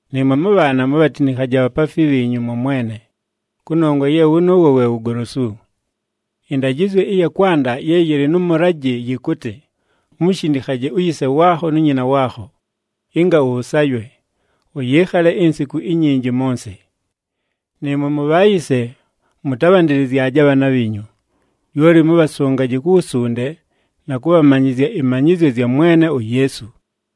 Nɨɨmwe mʉbhaana, mubhatinikhaje abhapaafi bhiinyu mwa Mwene, kʉnongwa ye wʉnʉʉwo we wugolosu. Ɨndajɨzyo ɨya kwanda ye yɨlɨ nʉ mʉlajɨ yɨkʉtɨ, “Umushindikhaje uyise waakho nu nyina waakho, ɨnga ʉsaywe, ʉyɨɨkhale insiku inyinji mʉ nsɨ.” Nɨɨmwe mubhayise, mʉtabhandɨlɨzyaje abhaana bhiinyu, lyoli mʉbhasʉngaje ku wusunde na kʉbhamanyɨzya ɨmanyɨzyo zya Mwene uYeesu.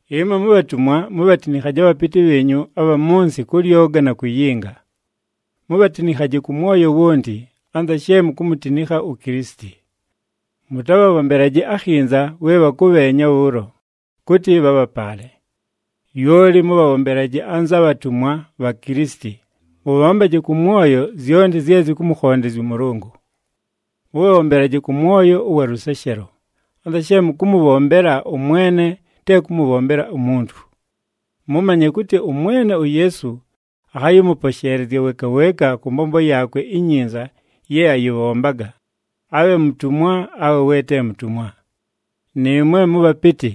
Ɨmwe mubhatumwa, mubhatinikhaje abhapɨtɨ bhiinyu abha mʉ nsɨ kʉ lyoga na kuyinga. Mubhatinikhaje kʉ mwoyo wonti, anza she mukumutinikha uKilisiti. Mʉtabhabhombelaje akhinza we bhakʉbheenya bhʉʉlo, kʉtɨ bhabhapaale. Lyoli mʉbhabhombelaje anza bhatumwa bha Kilisiti, mʉbhombaje kʉ mwoyo zyonti zye zɨkʉmʉkhondezya ʉMʉlʉngʉ. Mʉbhabhombelaje kʉ mwoyo ʉwa lʉseshelo, anza she mʉkʉmʉbhombela ʉMwene te kʉmʉbhombela umuntu. Mʉmanye kʉtɨ ʉMwene uYeesu akhayɨmʉposheelezya weeka weeka kʉ mbombo yaakwe inyinza ye ayɨbhombaga, abhe mutumwa awe we te mutumwa. Nɨɨmwe mʉbhapɨtɨ,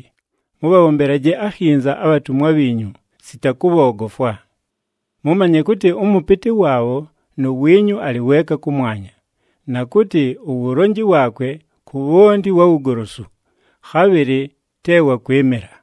mʉbhabhombelaje akhinza abhatumwa bhiinyu sita kʉbhoogofwa. Mʉmanye kʉtɨ ʉmʉpɨtɨ waabho nu wiinyu alɨ weeka kʉmwanya, na kʉtɨ, uwulonji waakwe ku bhonti wa wugolosu, khabhɨlɨ te wa kwɨmɨla.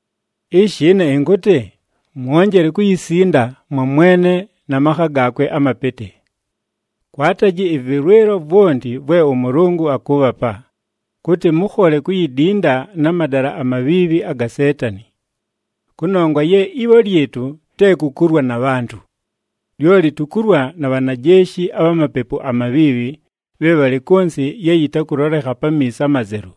Ishi ɨne ɨnkʉtɨ, mwonjele kuyisinda mwa Mwene na makha gaakwe amapɨtɨ. Kwataji ɨvɨlwɨlo vwonti vwe ʉMʉlʉngʉ akʉʉbhapa, kʉtɨ mʉkhole kuyidinda na madala amabhiibhi aga Seetani. Kʉnongwa ye ibho lyɨtʉ te ku kulwa na bhantʉ. Lyoli tukulwa na bhanajeeshi abha mapepu amabhiibhi bhe bhalɨ kʉ nsɨ ye yɨtakʉlolekha pamiiso amazelu,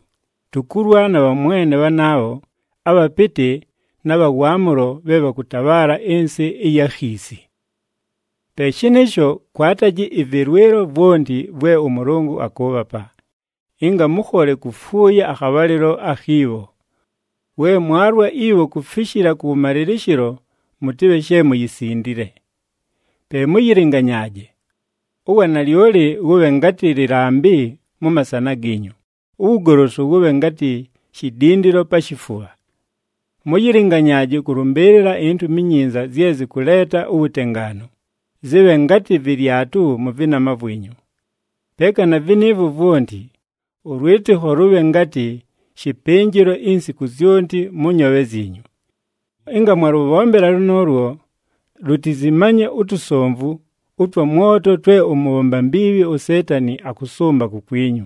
tukulwa na bhamwene bhanaabho, abhapɨtɨ na bha waamʉlo bhe bhakʉtabhaala ɨnsɨ ɨya khiisi. Pe shɨnɨɨsho, kwataji ɨvɨlwɨlo vwonti vwe ʉMʉlʉngʉ akʉʉbhapa, ɨnga mʉkhole kufuuya akhabhalɨlo akhi bho. We mwalwa ibho kufishila kʉwʉmalɨlɨshɨlo, mʉtɨbhe she muyisindile. Pe mʉyɨlɨnganyaaje. Uwanalyoli wʉbhe ngatɨ lɨlambɨ mʉ masana giinyu, uwugolosu wʉbhe ngatɨ shidindilo pa shifubha. Mʉyɨlɨnganyaaje kʉlʉmbɨɨlɨla iNtumi iNyinza zye zɨkʉleeta uwutengaanu, zɨbhe ngatɨ vɨlyatʉ mʉ vɨnama vwinyu. Peeka na vɨnɨɨvwo vwonti, ʉlwɨtɨkho lʉbhe ngatɨ shɨpɨnjɨlo insiku zyonti mʉ nyoobhe zyinyu. Ɨnga mwalʉbhombela lʉnʉʉlwo, lutizimanye utusomvu ʉtwa mwoto twe ʉmʉbhomba mbiibhi uSeetani akʉsʉmba kukwinyu.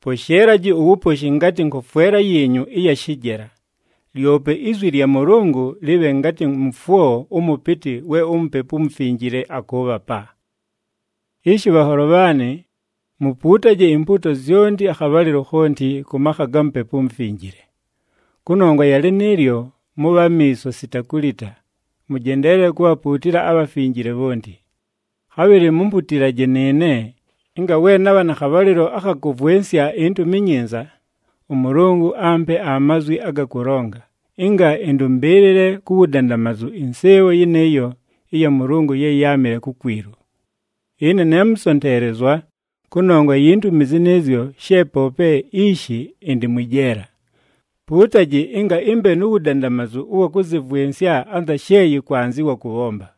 Posheelaji uwuposhi ngatɨ nkofwela yiinyu ɨya shɨjela, lyope izwi lya Mʉlʉngʉ lɨbhe ngatɨ mʉfwo ʉmʉpɨtɨ we uMupepu uMufinjile akʉʉbhapa. Ishi bhanholo bhaanɨ, mupuutaje impuuto zyonti akhabhalɨlo khonti kʉ makha ga Mupepu uMufinjile. Kʉnongwa ya lɨnɨɨlyo, mʉbhe amiiso sita kulita, mʉjendeelele kubhapuutila abhafinjile bhonti. Khabhɨlɨ mumputilaje nɨɨne ɨnga we nabha na khabhalɨlo akha kʉvwɨnsya iNtumi iNyinza, ʉMʉlʉngʉ ampe amazwi aga kʉlonga, ɨnga ɨndʉmbɨɨlɨle ku wudandamazu ɨnsɨɨbho yɨnɨɨyo ɨya Mʉlʉngʉ ye yáamɨle kukwilu. Ɨne ne mʉsonteelezwa kʉnongwa yi ntumi zɨnɨɨzyo she poope ishi ɨndɨ mwɨ jeela. Puutaji ɨnga ɨmbe nu wudandamazu ʉwa kʉzɨvwɨnsya anza she yɨkwanzɨwa kʉbhomba.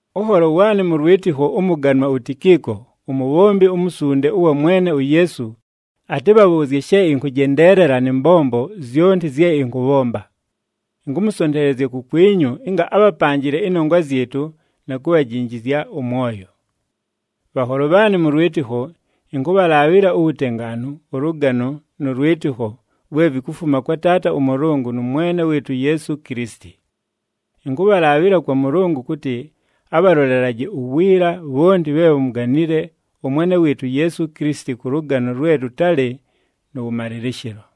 Ʉnholo waanɨ mʉ lwɨtɨkho ʉmʉganwa uTikiiko, umubhombi umusunde ʉwa Mwene uYeesu atɨbhabhʉʉzye she ɨnkʉjendeelela nɨ mbombo zyonti zye ɨnkʉbhomba. Ɨnkʉmʉsonteelezya kukwinyu ɨnga abhapanjɨle ɨnongwa zyɨtʉ na kubhajinjizya ʉmwoyo. Bhanholo bhaanɨ mʉ lwɨtɨkho, ɨnkʉbhalaabhɨla uwutengaanu, ʉlʉgano nʉ lwɨtɨkho vwe vikufuma kwa Taata ʉMʉlʉngʉ nʉ Mwene wɨɨtʉ uYeesu Kilisiti. Ɨnkʉbhalaabhɨla kwa Mʉlʉngʉ kʉtɨ abhalolelaje uwiila bhonti bhe bhamuganile ʉMwene wɨɨtʉ uYeesu Kilisiti kʉ lʉgano lwe lʉtalɨ nʉ wʉmalɨlɨshɨlo.